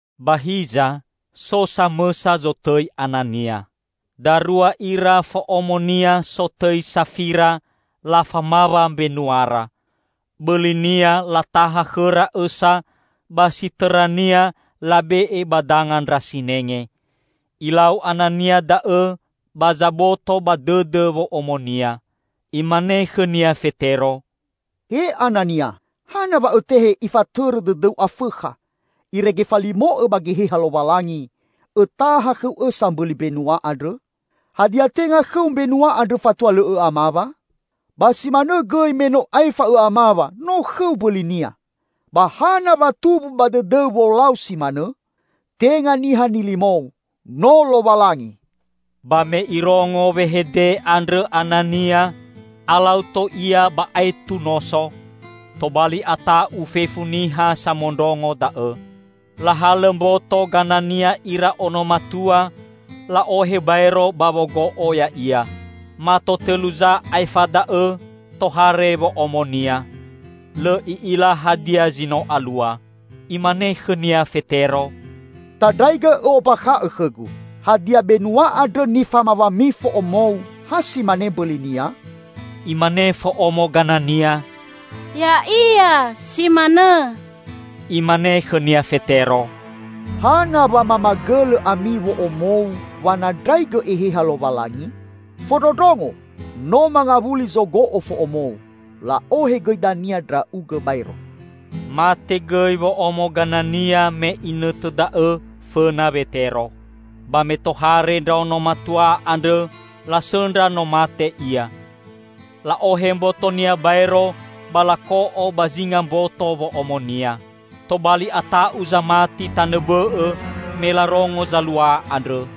Ba hiza, so samõsa zotõi Anania. Darua ira fo'omonia sotõi Safira lafamawa mbenuara. Bõlinia lataha khõra õsa ba si tõrania labe'e ba danga ndra sinenge. Ilau Anania da'õ ba zaboto ba dõdõ wo'omonia. Imane khõnia Fetero, "He Anania, hana wa õtehe ifatõrõ dõdõu Afõkha, irege falimo'õ ba Geheha Lowalangi, õtaha khõu õsa mbõli mbenua andrõ? Hadia, tenga khõu mbenua andrõ fatua lõ õ'amawa? Ba si manõ gõi me no aefa õ'amawa no khõu mbõlinia. Ba hana wa tumbu ba dõdõu wolau si manõ? Tenga niha nilimou, no Lowalangi!" Ba me irongo wehede andrõ Anania, alau tou ia ba aetu noso. Tobali ata'u fefu niha samondrongo da'õ. Lahalõ mboto Ganania ira ono matua, la'ohe baero ba wogo'o ya'ia. Mato tõlu za aefa da'õ tohare wo'omonia. Lõ i'ila hadia zi no alua. Imane khõnia Fetero, "Tandraigõ ombakha'õ khõgu: Hadia benua andrõ nifamawami fo'omou ha si mane mbõlinia?" Imane fo'omo Ganania, "Ya'ia, si manõ." Imane khõnia Fetero, "Hana wa mamagõlõ ami wo'omou wanandraigõ Eheha Lowalangi? Fondrondrongo! No mangawuli zogo'o fo'omou. La'ohe gõi dania ndra'ugõ baero." Mate gõi wo'omo Ganania me inõtõ da'õ fõna Wetero. Ba me tohare ndraono matua andrõ, lasõndra no mate ia. La'ohe mbotonia baero ba lako'o ba zinga mboto wo'omonia. Tobali ata'u zamati tanõ bõ'õ, me larongo zalua andrõ.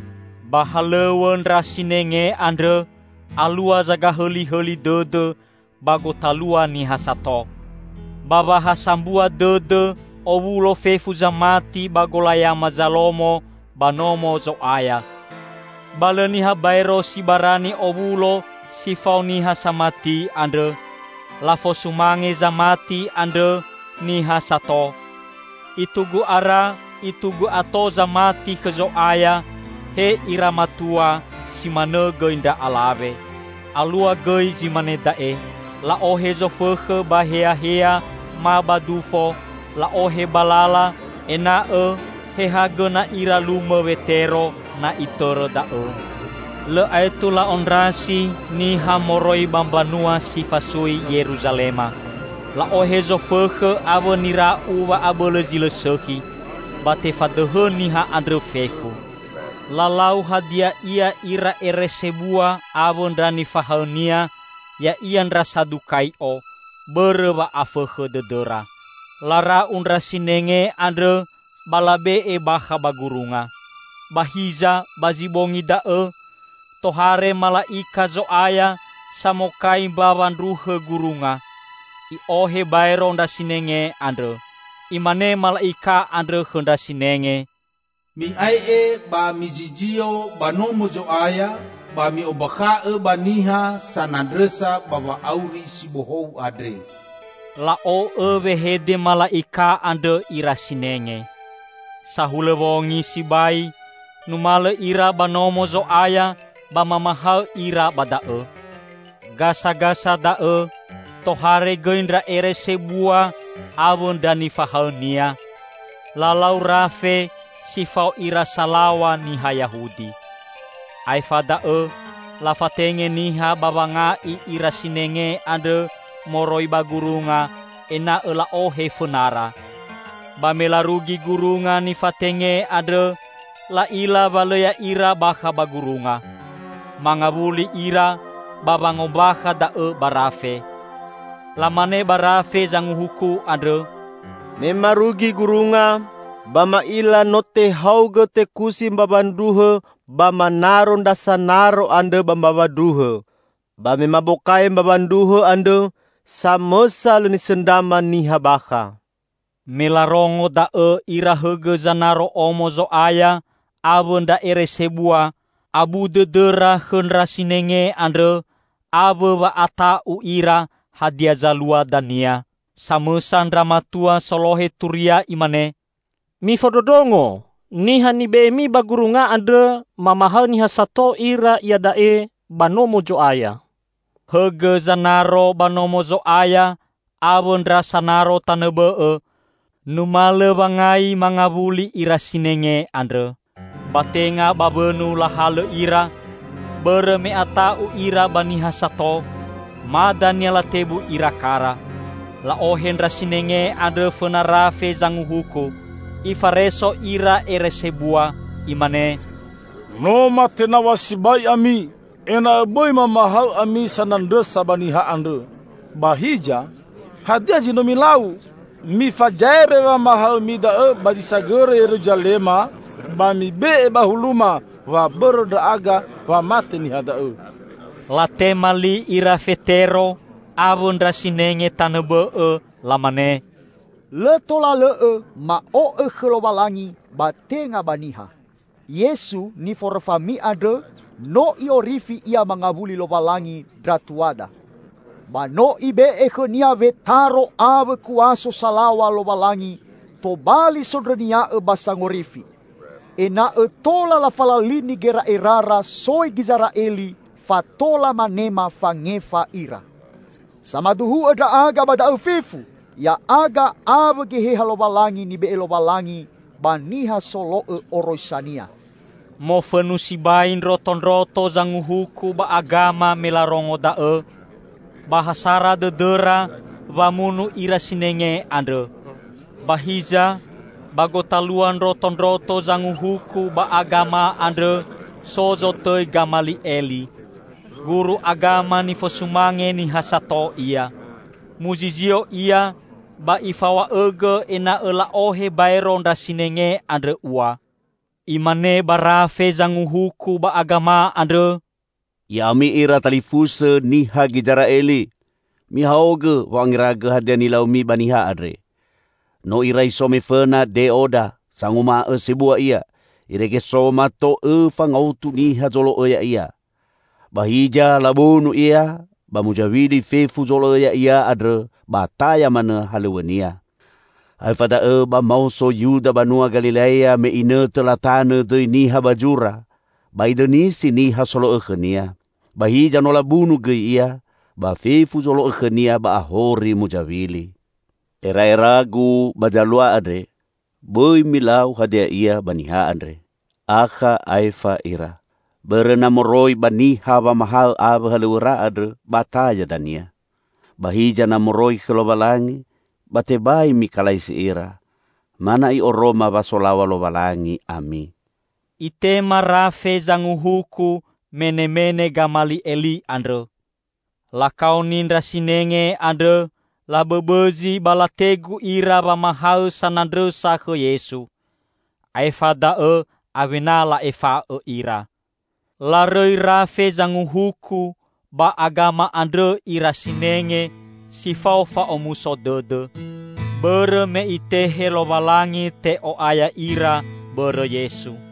Ba halõw̃õ ndra sinenge andrõ alua zagahõlihõli dõdõ ba gotalua niha sato. Ba wa ha sambua dõdõ owulo fefu zamati ba Golayama Zalomo ba Nomo Zo'aya. Ba lõ niha baero si barani owulo si fao niha samati andrõ. Lafosumange zamati andrõ niha sato. Itugu ara itugu ato zamati khõ Zo'aya -- he ira matua, si manõ gõi ndra alawe. Alua gõi zi mane da'e: la'ohe zofõkhõ ba heahea ma ba dufo, la'ohe ba lala, ena'õ he ha gõna ira lumõ Wetero, na itõrõ da'õ. Lõ aetu la'ondrasi niha moroi ba mbanua si fasui Yeruzalema. La'ohe zofõkhõ awõ nira'u wa'abõlõ zi lõ sõkhi. Ba tefadõhõ niha andrõ fefu. Lalau hadia ia ira ere sebua awõ ndra nifahaõnia, ya'ia ndra Sadukai'o bõrõ wa'afõkhõ dõdõra. Lara'u ndra sinenge andrõ ba labe'e bakha ba gurunga. Ba hiza ba zi bongi da'õ, tohare mala'ika Zo'aya samokai mbawa ndruhõ gurunga. I'ohe baero ndra sinenge andrõ. Imane mala'ika andrõ khõ ndra sinenge, "Mi'ae'e ba mizizio ba Nomo Zo'aya ba mi'ombakha'õ ba niha sanandrõsa ba wa'auri si bohou andre." La'o'õ wehede mala'ika andrõ ira sinenge. Sahulõ wongi sibai numalõ ira ba Nomo Zo'aya ba mamahaõ ira ba da'õ. Gasagasa da'õ tohare gõi ndra ere sebua awõ ndra nifahaõnia, lalau rafe si fao ira salaw̃a niha Yahudi. Aefa da'õ lafatenge niha ba wanga'i ira sinenge andrõ moroi ba gurunga ena'õ la'ohe fõnara. Ba me larugi gurunga nifatenge andrõ, la'ila wa lõ ya'ira bakha ba gurunga. Mangawuli ira ba wangombakha da'õ ba rafe. Lamane ba rafe zanguhuku andrõ, "me marugi gurunga, ba ma'ila no tehaogõ tekusi mbawa ndruhõ ba manaro ndra sanaro andrõ ba mbawa ndruhõ. Ba me mabokai mbawa ndruhõ andrõ, samõsa lõ nisõndrama niha bakha." Me larongo da'õ ira hõgõ zanaro Omo Zo'aya awõ ndra ere sebua, abu dõdõra khõ ndra sinenge andrõ awõ wa'ata'u ira hadia zalua dania. Samõsa ndra matua solohe turia imane, "Mifondrondrongo! Niha nibe'emi ba gurunga andrõ, mamahaõ niha sato ira iada'e ba Nomo Zo'aya!" Hõgõ zanaro ba Nomo Zo'aya awõ ndra sanaro tanõ bõ'õ, numalõ wangai mangawuli ira sinenge andrõ. Ba tenga ba wõnu lahalõ ira, bõrõ me ata'u ira ba niha sato; ma dania latebu ira kara. La'ohe ndra sinenge andrõ fõna rafe zanguhuku. Ifareso ira ere sebua. Imane, "No matenaw̃a sibai ami ena'õ bõi mamahaõ ami sanandrõsa ba niha andrõ. Ba hiza, hadia zi no milau! Mifazaewe wamahaõmi da'õ ba zi sagõrõ Yeruzalema, ba mibe'e ba huluma wa bõrõ ndra'aga wa mate niha da'õ." Latema li ira Fetero awõ ndra sinenge tanõ bõ'õ, lamane, "Lõ tola lõ'õ ma'o'õ khõ Lowalangi ba tenga ba niha. Yesu, niforõfami andrõ, no I'orifi Ia mangawuli Lowalangi ndra tuada. Ba no Ibe'e khõ-Nia wetaro awõ kuaso salaw̃a Lowalangi tobali Sondrõnia'õ ba Sangorifi; ena'õ tola lafalalini gera'erara soi Gizera'eli fa tola manema fangefa ira. Samaduhu'õ ndra'aga ba da'õ fefu -- ya'aga awõ Geheha Lowalangi nibe'e Lowalangi ba niha solo'õ oroisa-Nia." Mofõnu sibai ndrotondroto Zanguhuku ba Agama me larongo da'õ, ba ha sara dõdõra wamunu ira sinenge andrõ. Ba hiza ba gotalua ndrotondroto Zanguhuku ba Agama andrõ so zotõi Gamali'eli. Guru agama nifosumange niha sato ia. Muzizio ia ba ifaw̃a'õgõ ena'õ la'ohe baero ndra sinenge andrõ ua. Imane ba rafe Zanguhuku ba Agama andrõ, "Ya'ami ira talifusõ niha Gizera'eli! Mihaogõ wo'angeragõ hadia nilaumi ba niha andre. No irai so mefõna Deoda, sanguma'õ sebua ia, irege so mato õfa ngaotu niha zolo'õ ya'ia. Ba hiza labunu ia ba muzawili fefu zolo'õ ya'ia andrõ ba taya manõ halõw̃õnia. Aefa da'õ ba maoso Yuda banua Galilea me inõtõ latanõ dõi niha ba zura, ba idõnisi niha solo'õ khõnia. Ba hiza no labunu gõi ia, ba fefu zolo'õ khõnia ba ahori muzawili. Era'eragu ba zalua andre: bõi milau hadia ia ba niha andre, akha aefa ira. Bõrõ na moroi ba niha wamahaõ awõ halõw̃õra andrõ ba taya dania. Ba hiza na moroi khõ Lowalangi, ba tebai mikalaisi ira. Ma na'i oroma wa solaw̃a Lowalangi ami." Itema rafe zanguhuku menemene Gamali'eli andrõ. Lakaoni ndra sinenge andrõ labõbõzi ba lategu ira wamahaõ sanandrõsa khõ Yesu. Aefa da'õ awena la'efa'õ ira. Larõi rafe Zanguhuku ba Agama andrõ ira sinenge si fao fa'omuso dõdõ, bõrõ me Itehe Lowalangi te'o'aya ira bõrõ Yesu.